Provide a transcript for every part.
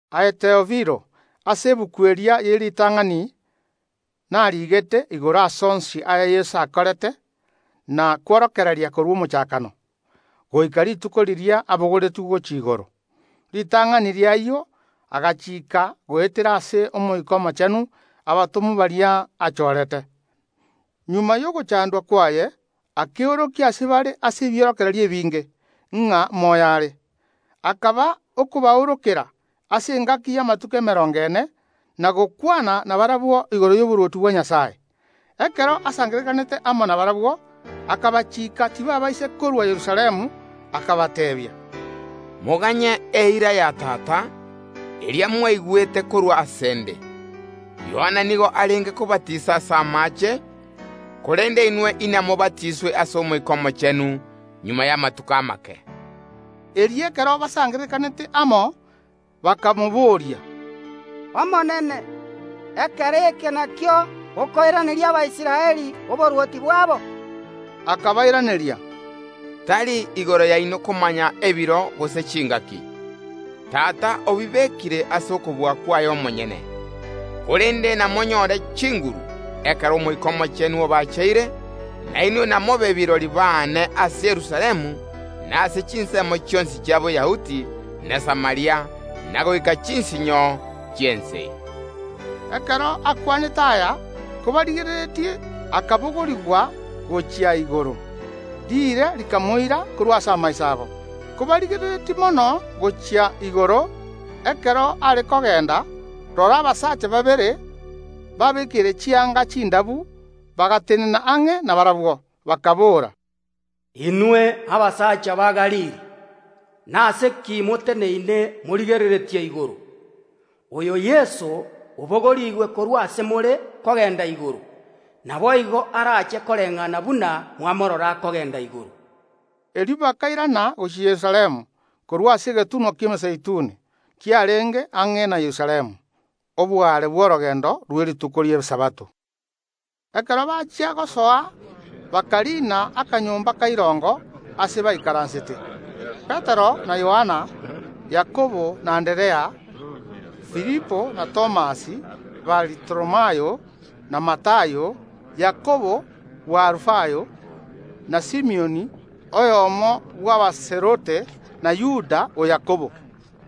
Aye Theofilo, ase egetabu keria kie ritang’ani nariigete igoro y’amang’ana onsi aya Yeso akorete na kworokereria ekero achaagete emeremo yaye, goika rituko riria abogoretigwe gochia igoro. Ritang’ani ri’ayio agachiika goetera ase Omoika Omochenu abatomwa baria achoorete. Magega y’ogochandwa kwaye akeorokia ase bare ase ebiorokererio ebinge ng’a moyo are. Akaba okobaorokera ase engaki y’amatuko emerongo ene, na gokwana nabarabwo igoro y’oborwoti bwa Nyasae. Ekero asangererekanete amo nabarabwo, akabachiika tibabaisa korua Yerusalemu, akabateebia: “Moganye eira ya Tata, eria mwaigwete korwa ase ’nde. Yohana nigo arenge kobatisa ase amaache, korende inwe inamobatiiswe ase Omoika Omochenu magega y’amatuko amake.” Erio ekero basangererekanete amo, bakamobooria: “Omonene, ekero eke nakio okoiraneria Abaisraeli oborwoti bwabo?” Akabairaneria: “Tari igoro yaino komanya ebiro gose chingaki. Tata obibeekire ase okobua kwaye omonyene. Korende namonyore chinguru, ekero Omoika Omochenu abacheire, na inwe inamobe kirori baane ase Yerusalemu, na ase chinsemo chionsi chia Boyahudi na Samaria, na goika chinsinyo chi’ense.” Ekero akwanete aya, kobarigereretie, akabogorigwa gochia igoro, riire rikamoira korwa ase amaiso abo. Kobarigereretie mono gochia igoro, ekero are kogenda, rora, abasacha babere, babeekeire chianga chindabu, bagatenena ang’e nabarabwo, bakaboora: “Inwe abasacha ba Galili, nase ki moteneine morigereretie gochia igoro? Oyo Yeso, obogorigwe korwa as more kogenda igoro, naboigo naende arairane koreng’ana buna mwamorora akogenda igoro.” Erio aborokigwa bakairana gochia Yerusalemu korwa ase egetunwa ki’Emezeituni, ekio kiarenge ang’e na Yerusalemu, oboare bw’orogendo rw’ekiromita eyemo. Ekero bachia gosoa, bakariina akanyomba ka irongo aase baikaransete: Petero na Yohana, Yakobo na Anderea, Filipo na Thomas, Baritholomayo na Matayo, Yakobo bw’Alufayo na Simioni, oyomo bw’Abazelote, na Yuda o Yakobo.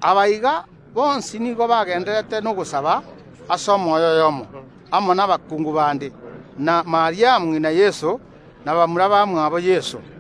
Aba iga bonsi nigo bagendererete n’ogosaba ase omoyo oyomo, amo nabakungu bande, na Mariamu ng’ina Yeso, na bamura bamwabo Yeso.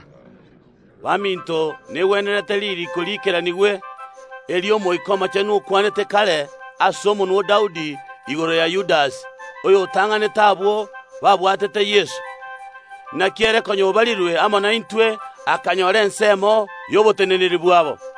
Abeegeni baminto, negwenerete ririiko erio riikeranigwe, eri Omoika Omochenu okwanete kare ase omonwa o Daudi igoro ya Yudasi, oyotang’anete abanto abwo babwatete Yeso. Naki Yudasi konya obarirwe amo naintwe, akanyora ensemo y’obokoreri amo naitwe.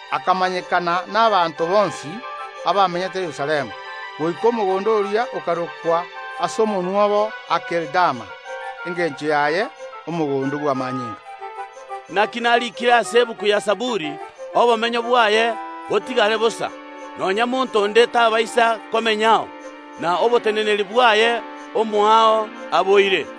Ayio akamanyekana n’abanto bonsi abamenyete Yerusalemu, goika omogondo oria okarokwa ase omonwa obo Akeldama, engencho yaye: Omogondo bw’Amanyinga.) Naki nariikire ase egetabu gia Zaburi: Obomenyo bwaye botigare bosa, nonya monto onde tabaisa komenyao; naende nerikiire: Oboteneneri bwaye omoao aboire.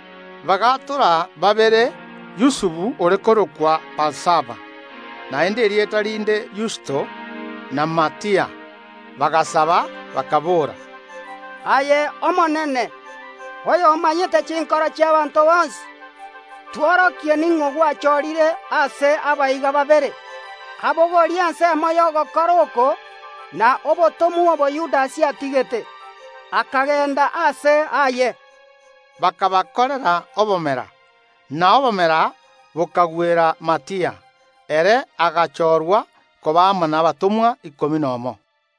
Bagaatora babere, Yusufu ore korokwa Barsaba, naende erieta rinde Yusto, na Matia. Bagasaba, bakaboora: “Aye omonene, oyomanyete chinkoro chi’abaanto bonsi, tworokie ning’o gwachorire ase aba iga babere abogorie ensemo y’ogokora oko na obotomwa obo Yudasi atigete, akagenda aase aye.” Bakabarutera obomera, na obomera bokagwera Matia; erio ere agachorwa koba amo nabatomwa ikomi nomo.